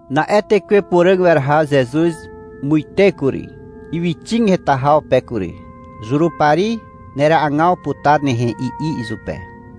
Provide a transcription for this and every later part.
Na'e Tekwe Puràg weraha Zezuz muite kury, ywyxig heta haw pe kury. — Zurupari neragaw putar nehe, i'i izupe.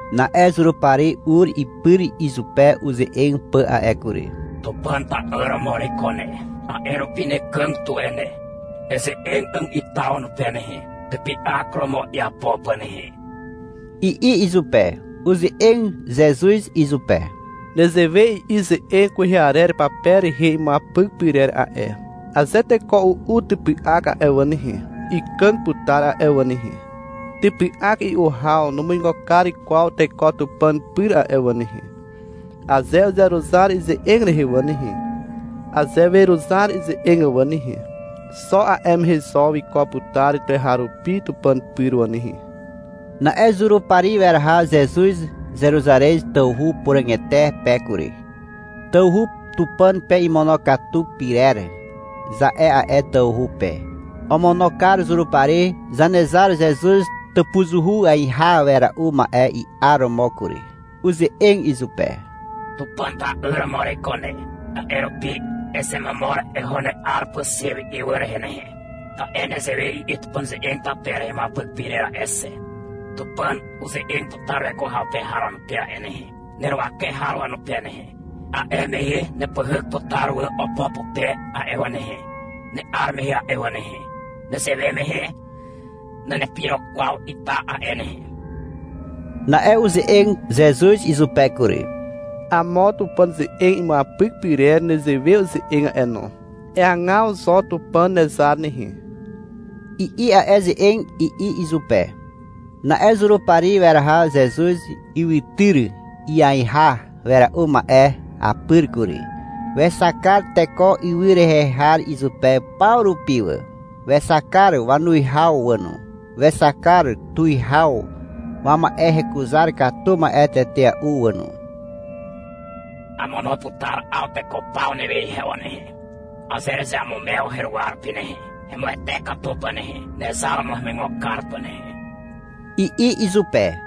Na'e Zurupari ur ipyr izupe uze'eg pà a'e kury. — Tupàn ta'yr romo ereiko ne. A'e rupi nekàg tuwe ne. Eze'eg 'àg ita wanupe nehe, typy'ak romo iapo pà nehe, i'i izupe. Uze'eg Zezuz izupe. — Nezewe i'i ze'eg kwehe arer pape rehe imuapyk pyrer a'e. Aze teko u'u typy'ak a'e wà nehe, ikàg putar a'e wà nehe. Typy'ak i'u haw numuigo kar kwaw teko Tupàn pyr a'e wà nehe. Aze uzeruzar ize'eg rehe wà nehe, aze weruzar ize'eg wà nehe, Xo a'e mehe zo wiko putar tuweharupi Tupàn pyr wà nehe. Na'e Zurupari weraha Zezuz Zeruzarez tawhu puràgete pe kury. (Tawhu Tupàn pe imonokatu pyrer, za'e a'e tawhu pe.) Omono kar Zurupari Zanezar Zezuz tàpuzuhu aiha wera'u ma'e i'aromo kury. Uze'eg izupe. — Tupàn ta'yr romo ereiko ne, a'e rupi ezemomor eho ne'ar pà xe wi ywy rehe nehe, ta'e nezewe i'i Tupàn ze'eg pape rehe imuapyk pyrer a'e xe. Tupàn uze'eg putar weko haw pe har wanupe a'e nehe, neruwake har wanupe nehe. A'e mehe nepyhyk putar wà opo pupe a'e wà nehe, ne'ar mehe a'e wà nehe. Nezewe mehe nanepirok kwaw ita a'e nehe. Na'e uze'eg Zezuz izupe kury. — Amo Tupàn ze'eg imuapyk pyrer nezewe uze'eg a'e no. — Eagaw zo Tupàn nezar nehe, i'i a'e ze'eg, i'i izupe. Na'e Zurupari weraha Zezuz ywytyr iaiha wera'u ma'e apyr kury. Wexak kar teko ywy rehe har izupe paw rupi wà, wexak kar wanuwihaw wà no, wexak kar tuwihaw wama'e hekuzar katu ma'e tetea'u wà no. — Amono putar 'aw teko paw newe ihe wà nehe, aze erezeamumew heruwa rupi nehe, hemuwete katu pà nehe, nezar romo hemuigo kar pà nehe, i'i izupe.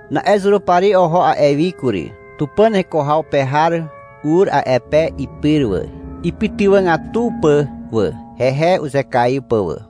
Na'e Zurupari oho a'e wi kury. Tupàn heko haw pe har ur a'e pe ipyr wà, ipytywàgatu pà wà, hehe uzekaiw pà wà.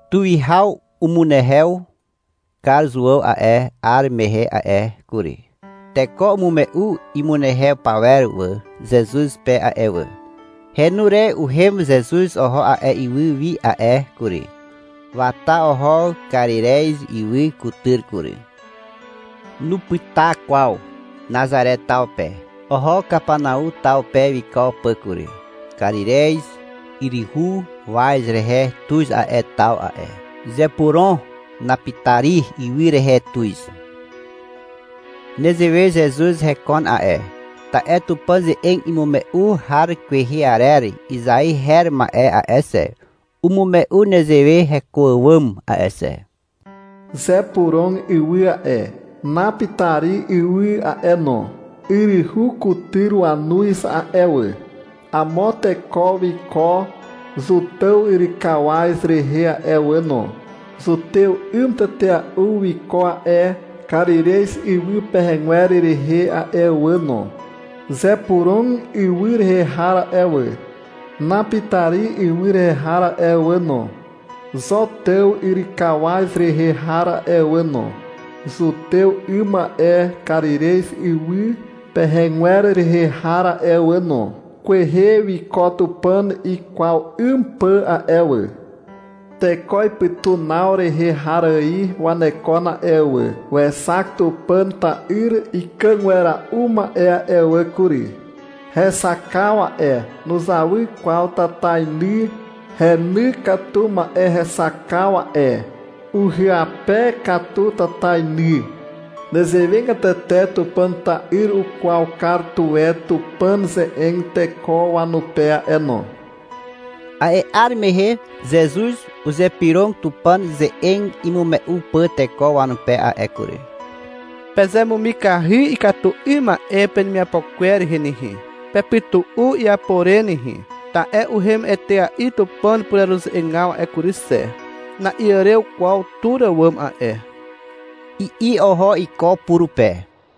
Tuwihaw umunehew kar Zuàw a'e 'ar mehe a'e kury. Teko umume'u imunehew pawer wà Zezuz pe a'e wà. Henu re uhem Zezuz oho a'e ywy wi a'e kury. Wata oho Karirez ywy kutyr kury. Nupyta kwaw Nazare taw pe. Oho Kapanau taw pe wiko pà kury. Karirez yryhu waz rehe tuz a'e taw a'e. Zepurom Napitari ywy rehe tuz. Nezewe Zezuz hekon a'e, ta'e Tupàn ze'eg imume'u har kwehe arer Izai her ma'e a'e xe, umume'u nezewe heko àwàm a'e xe. Zepurom ywy a'e, Napitari ywy a'e no, Yryhu kutyr wanuz a'e wà. Amo teko wiko Zotàw yrykawaz rehe a'e wà no. Zutew 'ym tetea'u wiko a'e Karirez ywy pehegwer rehe a'e wà no. Zepurom ywy rehe har a'e wà, Napitari ywy rehe har a'e wà no, Zotàw yrykawaz rehe har a'e wà no, Zutew 'ym a'e Karirez ywy pehegwer rehe har a'e wà no, Kwehe wiko Tupàn ikwaw 'ym pà a'e wà. Teko ipytunaw rehe har ài wanekon a'e wà Wexak Tupàn ta'yr ikàg wera'u ma'e a'e wà kury. Hexakaw a'e, nuzawy kwaw tatainy heny katu ma'e hexakaw a'e. Uhyape katu tatainy. Nezewegatete Tupàn ta'yr ukwaw kar tuwe Tupàn ze'eg teko wanupe a'e no. A'e 'ar mehe Zezuz uzypyrog Tupàn ze'eg imume'u pà teko wanupe a'e kury. — Pezemumikahy ikatu 'ym ma'e penemiapo kwer rehe nehe, pepytu'u iapo re nehe. Ta'e uhem etea'i Tupàn pureruze'egaw a'e kury xe, na'iàrew kwaw tur àwàm a'e, i'i oho iko purupe.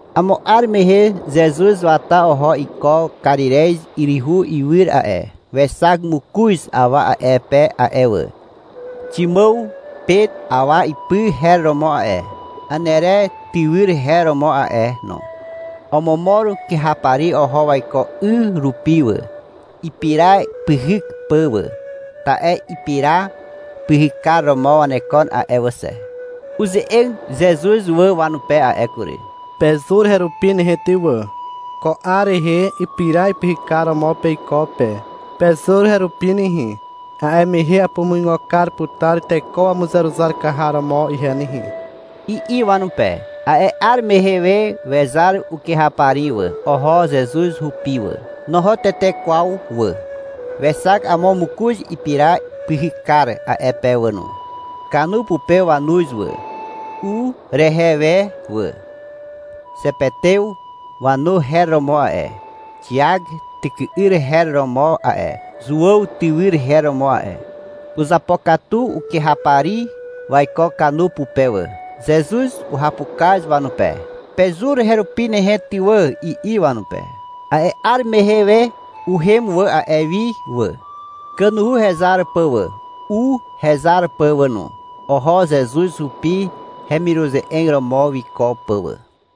Amo 'ar mehe Zezuz wata oho iko Karirez yryhu iwyr a'e. Wexak mokoz awa a'e pe a'e wà. Ximàw Pet awa ipy her romo a'e. Anere tywyr her romo a'e no. Omomor kyhapari oho waiko 'y rupi wà, ipira pyhyk pà wà. Ta'e ipira pyhykar romo wanekon a'e wà xe. Uze'eg Zezuz wà wanupe a'e kury. — Pezur herupi nehe ty wà. Ko 'ar rehe, ipira pyhykar romo peiko pe. Pezur herupi nehe, a'e mehe apumuigo kar putar teko wamuzeruzar kar har romo ihe nehe, i'i wanupe. A'e 'ar mehe we wezar ukyhapari wà. Oho Zezuz hupi wà. Noho tete kwaw wà. Wexak amo mokoz ipira pyhykar a'e pe wà no. Kanu pupe wanuz wà, u rehe we wà. Zepetew wanu her romo a'e. Xiak tyky'yr her romo a'e. Zuàw tywyr her romo a'e. Uzapokatu ukyhapari waiko ukanu pupe wà. Zezuz uhapukaz wanupe. — Pezur herupi nehe ty wà, i'i wanupe. A'e 'ar mehe we uhem wà a'e wi wà, kanuhu hezar pà wà, u hezar pà wà no. Oho Zezuz hupi hemiruze'eg romo wiko pà wà.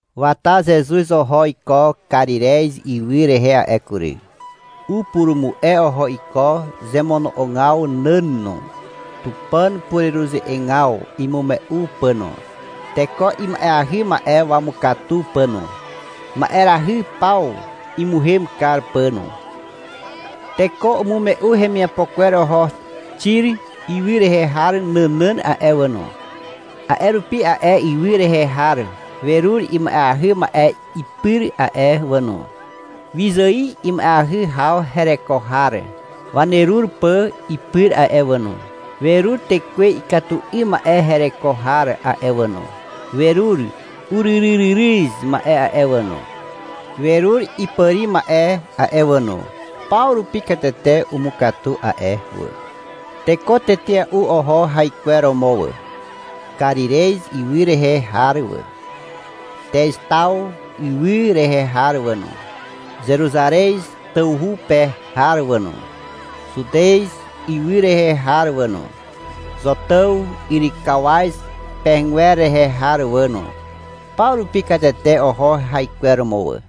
Wata Zezuz oho iko Karirez ywy rehe a'e kury. Upurumu'e oho iko zemono'ogaw nàn no, Tupàn pureruze'egaw imume'u pà no, teko ima'eahy ma'e wamukatu pà no, ma'erahy paw imuhem kar pà no. Teko umume'u hemiapo kwer oho Xir ywy rehe har nànàn a'e wà no. A'e rupi a'e ywy rehe har werur ima'eahy ma'e ipyr a'e wà no, wyzài ima'eahy haw hereko har wanerur pà ipyr a'e wà no. Werur tekwe ikatu 'ym ma'e hereko har a'e wà no, werur uryryryryz ma'e a'e wà no, werur ipàri ma'e a'e wà no. Paw rupi katete umukatu a'e wà. Teko tetea'u oho haikweromo wà. Karirez ywy rehe har wà, Teztaw ywy rehe har wà no, Zeruzarez tawhu pe har wà no, Zutez ywy rehe har wà no, Zotàw yrykawaz pehegwer rehe har wà no. Paw rupi katete oho haikweromo wà.